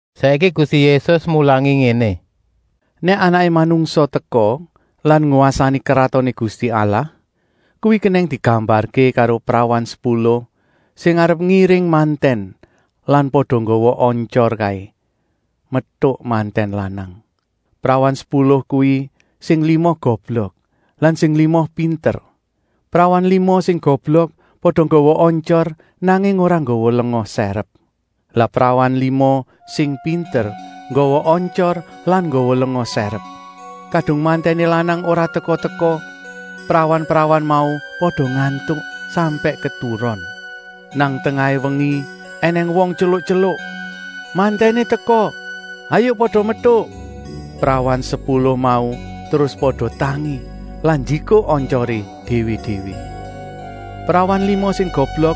Saiki Gusti Yésus mulangi ngéné: “Nèk Anaké Manungsa teka lan ngwasani Kratoné Gusti Allah, kuwi kenèng digambarké karo prawan sepuluh sing arep ngiring mantèn lan pada nggawa ontyor kaé, metuk mantèn lanang. Prawan sepuluh kuwi sing lima goblok lan sing lima pinter. Prawan lima sing goblok pada nggawa ontyor, nanging ora nggawa lenga sèrep. Lah prawan lima sing pinter nggawa ontyor lan nggawa lenga sèrep. Kadung mantèné lanang ora teka-teka, prawan-prawan mau pada ngantuk, sampèk keturon. “Nang tengahé wengi ènèng wong tyeluk-tyeluk: ‘Mantèné teka, hayuk pada metuk!’ Prawan sepuluh mau terus pada tangi lan njikuk ontyoré déwé-déwé. Prawan lima sing goblok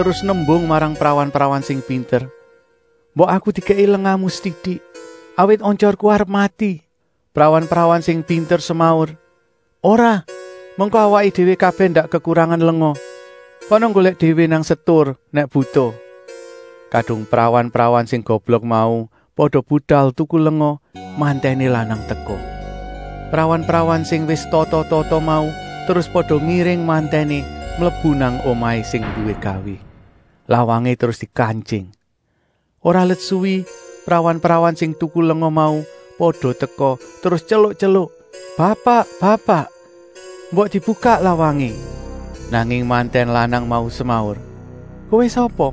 terus nembung marang prawan-prawan sing pinter: ‘Mbok aku dikèki lengamu setitik, awit ontyorku arep mati.’ Prawan-prawan sing pinter semaur: ‘Ora, mengko awaké déwé kabèh ndak kekurangan lenga. Kana nggolèk déwé nang setur nèk butuh.’ Kadung prawan-prawan sing goblok mau pada budal tuku lenga, mantèné lanang teka. Prawan-prawan sing wis tata-tata mau terus pada ngiring mantèné mlebu nang omahé sing nduwé gawé. Lawangé terus dikantying. “Ora let suwi prawan-prawan sing tuku lenga mau pada teka terus tyeluk-tyeluk: ‘Bapak, bapak, mbok dibukak lawangé!’ Nanging mantèn lanang mau semaur: ‘Kowé sapa,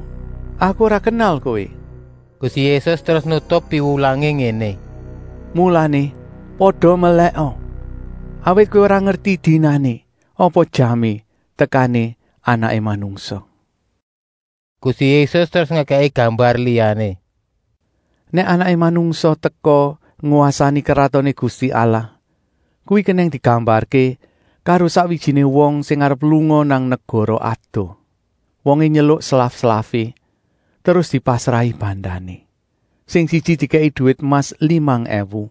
aku ora kenal kowé!’” Gusti Yésus terus nutup piwulangé ngéné: “Mulané pada melèka, awit kowé ora ngerti dinané apa jamé tekané Anaké Manungsa.” Gusti Yésus terus ngekèki gambar liyané: “Nèk Anaké Manungsa teka ngwasani Kratoné Gusti Allah, kuwi kenèng digambarké karo sakwijiné wong sing arep lunga nang negara adoh. Wongé nyeluk slaf-slafé, terus dipasrahi bandané. Sing siji dikèki duwit emas limang èwu,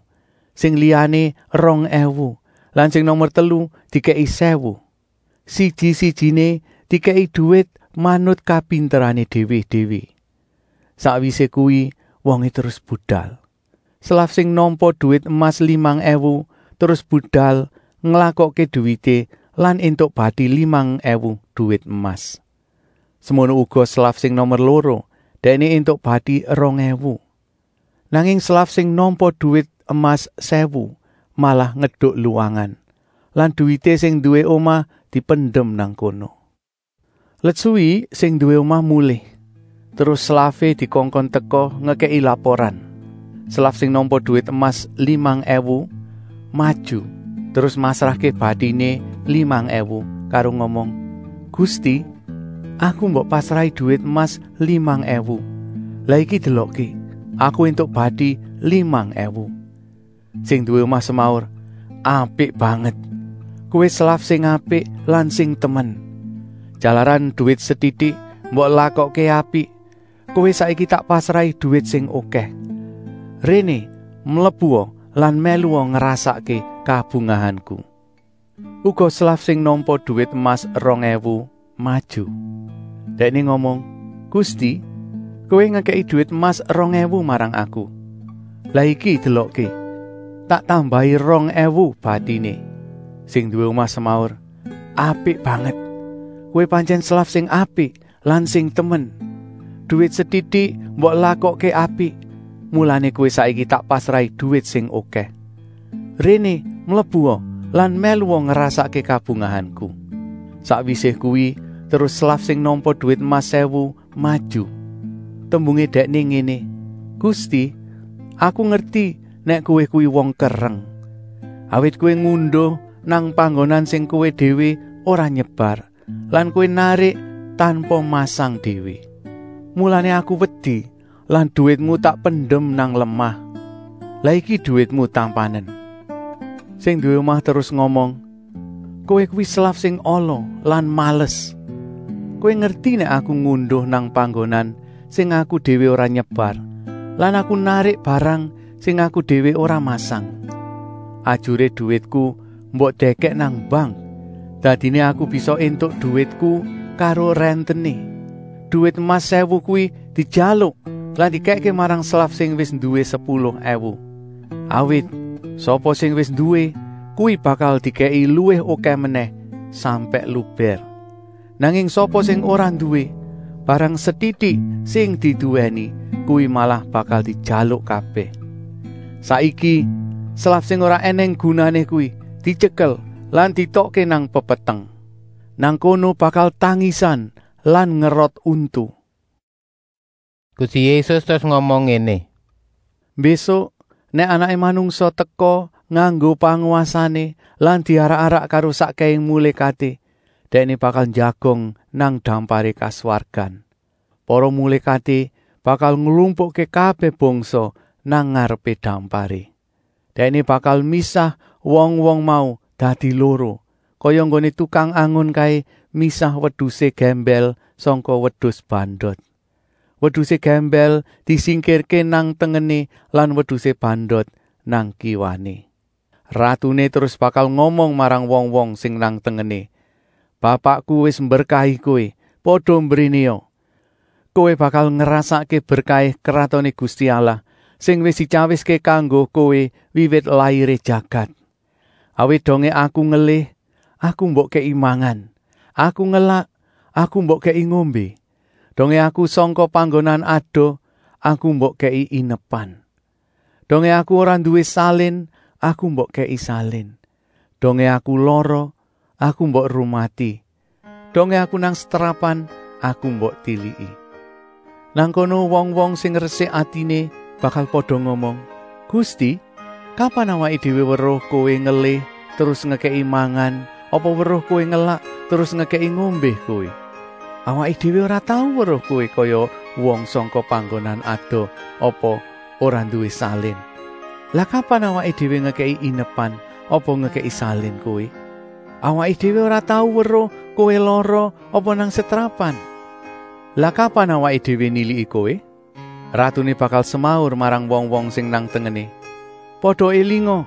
sing liyané rong èwu lan sing nomer telu dikèki sèwu. Siji-sijiné dikèki duwit manut kapinterané déwé-déwé. Sakwisé kuwi wongé terus budal. Slaf sing nampa duwit emas limang èwu terus budal nglakokké duwité lan éntuk bati limang èwu duwit emas. Semono uga slaf sing nomer loro, dèkné éntuk bati rong èwu. Nanging slaf sing nampa duwit emas sèwu malah ngeduk luwangan lan duwité sing nduwé omah dipendem nang kono. “Let suwi sing nduwé omah mulih, terus slafé dikongkon teka ngekèki laporan. Slaf sing nampa duwit emas limang èwu maju terus masrahké batiné limang èwu karo ngomong: ‘Gusti, aku mbok pasrahi duwit emas limang èwu, lah iki delokké, aku éntuk bati limang èwu.’ Sing nduwé omah semaur: ‘Apik banget, kowé slaf sing apik lan sing temen. Jalaran duwit setitik mbok lakokké apik, kowé saiki tak pasrahi duwit sing okèh. Réné mlebua lan mèlua ngrasakké kabungahanku.’ “Uga slaf sing nampa duwit emas rong èwu maju. Dèkné ngomong: ‘Gusti, kowé ngekèki duwit emas rong èwu marang aku, lah iki delokké, tak tambahi rong èwu batiné.’ Sing nduwé omah semaur: ‘Apik banget. Kowé pantyèn slaf sing apik lan sing temen. Duwit setitik mbok lakokké apik, mulané kowé saiki tak pasrahi duwit sing okèh. Réné mlebua lan mèlua ngrasakké kabungahanku.’ “Sakwisé kuwi terus slaf sing nampa duwit emas sèwu maju. Tembungé dèkné ngéné: ‘Gusti, aku ngerti nèk kowé kuwi wong kereng. Awit kowé ngunduh nang panggonan sing kowé déwé ora nyebar lan kowé narik tanpa masang déwé. Mulané aku wedi lan duwitmu tak pendem nang lemah. Lah iki duwitmu tampanen.’ “Sing nduwé omah terus ngomong: ‘Kowé kuwi slaf sing ala lan males. Kowé ngerti nèk aku ngunduh nang panggonan sing aku déwé ora nyebar lan aku narik barang sing aku déwé ora masang. Ajuré duwitku mbok dèkèk nang bank, dadiné aku bisa éntuk duwitku karo rèntené. Duwit emas sèwu kuwi dijaluk lan dikèkké marang slaf sing wis nduwé sepuluh èwu. Awit sapa sing wis nduwé, kuwi bakal dikèki luwih okèh menèh sampèk lubèr. Nanging sapa sing ora nduwé, barang setitik sing diduwèni kuwi malah bakal dijaluk kabèh. Saiki, slaf sing ora ènèng gunané kuwi dityekel lan dietokké nang pepeteng. Nang kono bakal tangisan lan ngerot untu.’” Gusti Yésus terus ngomong ngéné: “Mbésuk nèk Anaké Manungsa teka nganggo pangwasané lan diarak-arak karo sakkèhé mulékaté, Dèkné bakal njagong nang damparé kaswargan. Para mulékaté bakal nglumpukké kabèh bangsa nang ngarepé damparé. Dèkné bakal misah wong-wong mau dadi loro, kaya enggoné tukang angon kaé misah wedusé gèmbèl sangka wedus bandot. Wedusé gèmbèl disingkirké nang tengené lan wedusé bandot nang kiwané. Ratuné terus bakal ngomong marang wong-wong sing nang tengené: ‘Bapakku wis mberkahi kowé. Pada mbrénéa. Kowé bakal ngrasakké berkahé Kratoné Gusti Allah sing wis dityawiské kanggo kowé wiwit lairé jagat. Awit dongé Aku ngelih, Aku mbok kèki mangan. Aku ngelak, Aku mbok kèki ngombé. Dongé Aku sangka panggonan adoh, Aku mbok kèki inepan. Dongé Aku ora nduwé salin, Aku mbok kèki salin. Dongé Aku lara, Aku mbok rumati. Dongé Aku nang setrapan, Aku mbok tiliki.’ “Nang kono wong-wong sing resik atiné bakal pada ngomong: ‘Gusti, kapan awaké déwé weruh Kowé ngelih terus ngekèki mangan apa weruh Kowé ngelak terus ngekèki ngombé Kowé? Awaké déwé ora tau weruh Kowé kaya wong sangka panggonan adoh apa ora nduwé salin. Lah kapan awaké déwé ngekèki inepan apa ngekèki salin Kowé? Awaké déwé ora tau weruh Kowé lara apa nang setrapan. Lah kapan awaké déwé niliki Kowé?’ Ratuné bakal semaur marang wong-wong sing nang tengené: ‘Pada élinga,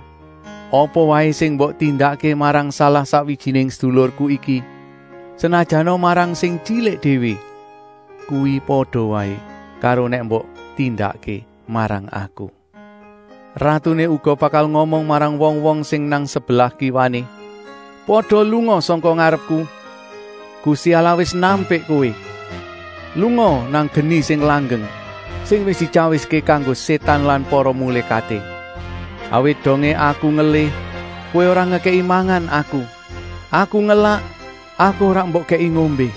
apa waé sing mbok tindakké marang salah-sakwijiné sedulurku iki, senajana marang sing tyilik déwé, kuwi pada waé karo nèk mbok tindakké marang Aku.’ “Ratuné uga bakal ngomong marang wong-wong sing nang sebelah kiwané: ‘Pada lunga sangka ngarepku! Gusti Allah wis nampik kowé. Lungaa nang geni sing langgeng, sing wis dityawiské kanggo Sétan lan para mulékaté. Awit dongé Aku ngelih, kowé ora ngekèki mangan Aku. Aku ngelak, Aku ora mbok kèki ngombé.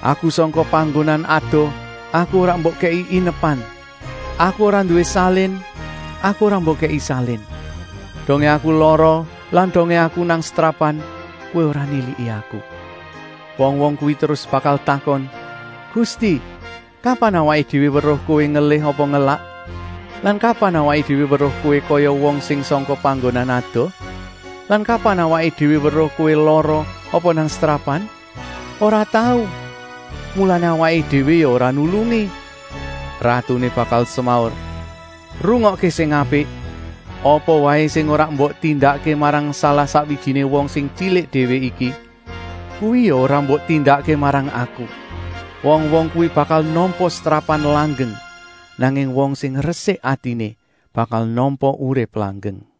Aku sangka panggonan adoh, Aku ora mbok kèki inepan. Aku ora nduwé salin, aku ora mbok kèki salin. Dongé Aku lara lan dongé Aku nang setrapan, kowé ora niliki Aku.’ “Wong-wong kuwi terus bakal takon: ‘Gusti, kapan awaké déwé weruh kowé ngelih apa ngelak? Lan kapan awaké déwé weruh Kowé kaya wong sing sangka panggonan adoh? Lan kapan awaké déwé weruh Kowé lara apa nang setrapan? Ora tau! Mulané awaké déwé ya ora nulungi!’ Ratuné bakal semaur: ‘Rungokké sing apik! Apa waé sing ora mbok tindakké marang salah-sakwijiné wong sing tyilik déwé iki, kuwi ya ora mbok tindakké marang Aku.’ Wong-wong kuwi bakal nampa setrapan langgeng, nanging wong sing resik atiné bakal nampa urip langgeng.”